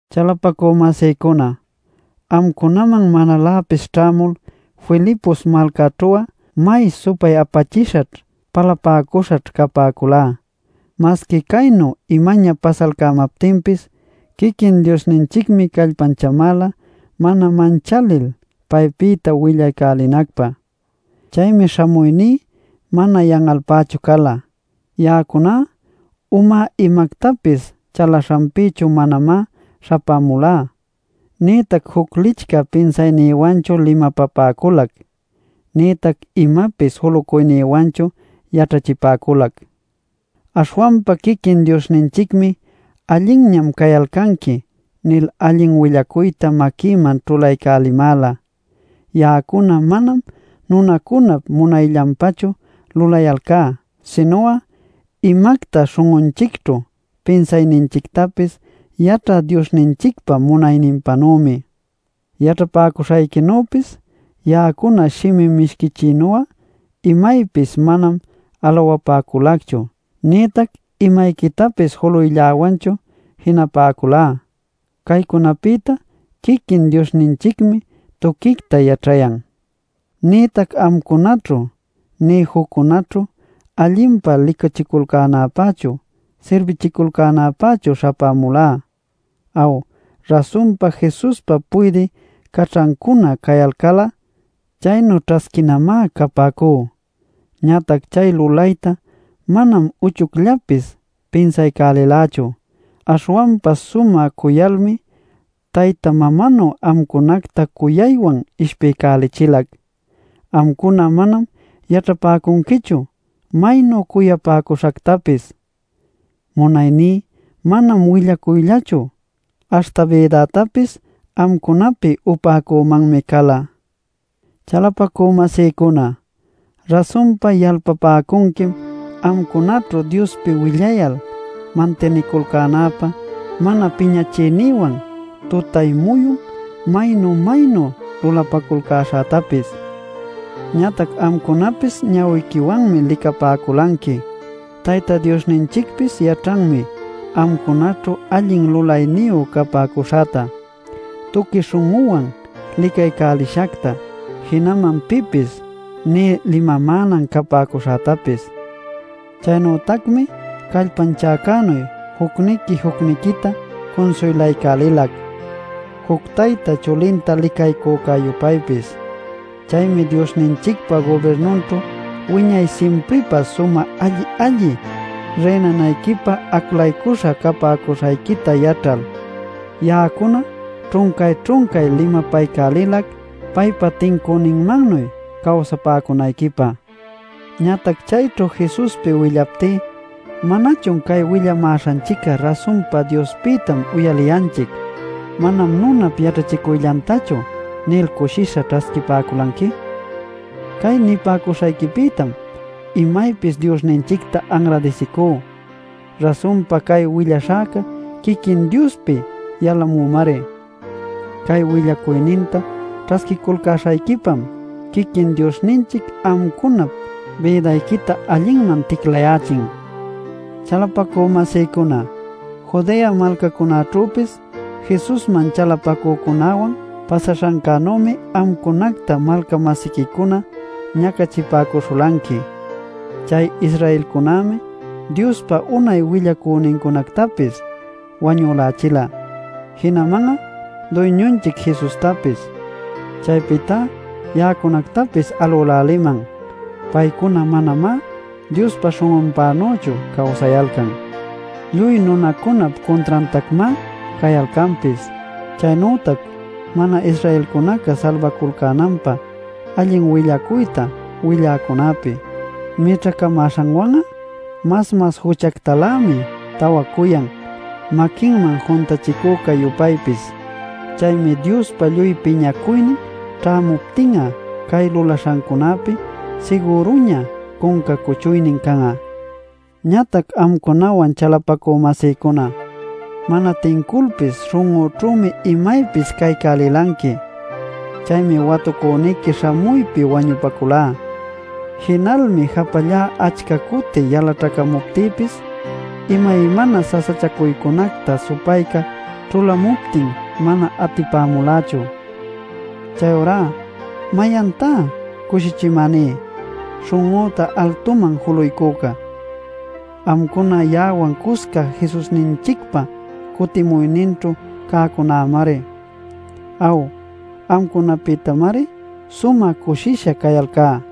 Chalapacü-masïcuna, amcunaman manaläpis ćhämul Filipos malcaćhu'a may supay-apachishaćh, palapäcuśhaćh capäculá. Masqui caynu imaña pasalcämaptinpis, quiquin Diosninchicmi callpanchamäla mana manchalil paypïta willaycälinacpä. Chaymi śhamuyní mana yan'alpächu cala. Ya'acuná umá imactapis chalaśhanpïchu manamá śhapämulá, nïtac juc licchä pinsaynïwanchu limapapäculac nïtac imapis julucuynïwanchu yaćhachipäculac. Aśhwanpa quiquin Diosninchicmi “Allinñam cayalcanqui” nil allin willacuyta maquïman ćhulaycälimäla. Ya'acuna manam nunacunap munayllanpächu lulayalcá sinu'a imacta śhun'unchicćhu pinsaśhanchictapis yaćhä Diosninchicpa munayninpänümi. Yaćhapäcuśhayquinüpis ya'acuna shimi mishquichïnu'a imaypis manam alawapäculacchu nïtac imayquitapis juluylläwanchu jinapäculá. Caycunapïta quiquin Diosninchicmi tuquicta yaćhayan. Nïtac amcunaćhu nï juccunaćhu allinpa licachiculcänäpächu, sirbichiculcänäpächu śhapämulá. Aw, rasunpa Jesuspa puydï caćhancuna cayalcal'a chaynu ćhasquinamá capäcú. Ñatac chay lulaytá manam uchucllapis pinsalcälilächu. Aśhwanpa sumä cuyalmi tayta mamanu amcunacta cuyaywan ishpiycälichilac. Amcuna manam yaćhapäcunquichu maynu cuyapäcuśhactapis. Munayní manam willaycuyllachu, aśhta bïdätapis amcunapi upäcümanmi cala. Chalapacü-masïcuna, rasunpa yalpapäcunquim amcunaćhu Diospi willayal mantiniculcänäpä mana piñachiynïwan tutay-muyun maynu-maynu lulapaculcäśhätapis. Ñatac amcunapis ñawiquiwanmi licapäculanqui, Tayta Diosninchicpis yaćhanmi amcunaćhu allin lulayniyu capäcuśhäta, tuqui śhun'üwan licaycälishacta, jinaman pipis nï limamänan capäcuśhätapis. Chaynütacmi callpanchäcänuy, jucniqui-jucniquita cunsuylaycälilac, juc tayta chulinta licaycücä-yupaypis. Chaymi Diosninchicpa gubirnunćhu wiñay simpripä sumä alli-alli rïnanayquipä aclacuśhan capäcuśhayquita yaćhal, ya'acuna ćhuncay-ćhuncay limapaycälilac paypa tincüninmannuy cawsapäcunayquipä. Ñatac chayćhu Jesuspi willaptí ¿manachun “Cay willamäśhanchic'a rasunpa Diospïtam uyaliyanchic; manam nunap yaćhachicuyllantachu” nil cushisha ćhasquipäculanqui? Cay nipäcuśhayquipïtam imaypis Diosninchicta anradisicú. Rasunpa cay willaśhäca quiquin Diospi yalamümari. Cay willacuyninta ćhasquiculcäśhayquipam quiquin Diosninchic amcunap bïdayquita allinman ticlayächin. Chalapacü-masïcuna, Judea malcacunaćhüpis Jesusman chalapacücunäwan pasaśhancänümi amcunacta malca-masiquicuna ñacachipäcuśhulanqui. Chay Israelcunämi Diospa unay willacünincunactapis wañülächila, jinaman'a Duyñunchic Jesustapis. Chaypïtá ya'acunactapis alüläliman. Paycuna manamá Diospa śhun'unpächu cawsayalcan; lluy nunacunap cuntrantacmá cayalcanpis. Chaynütac mana-Israelcunaca salbaculcänanpä allin willacuyta willäcunäpi mićhacamäśhanwan'a mas-mas juchactalämi tawacuyan maquinman juntachicucä-yupaypis. Chaymi Diospa lluy piñacuynin ćhämuptin'a cay lulaśhancunapi sigüruña cunca cuchuynin can'a. Ñatac amcunawan chalapacü-masïcuna, mana tinculpis śhun'üćhümi imaypis caycälilanqui. Chaymi watucüniqui śhamuypi wañupaculá. Jinalmi japallá achca cuti yalaćhacamuptïpis imaymana sasachacuycunacta supayca ćhulamuptin mana atipamulächu. Chayurá ¿mayantá cushichimäní, śhun'üta altuman juluycüca? Amcuna ya'awan cusca Jesusninchicpa cutimuyninćhu cäcunämari. Aw, amcunapïtamari sumä cushisha cayalcá.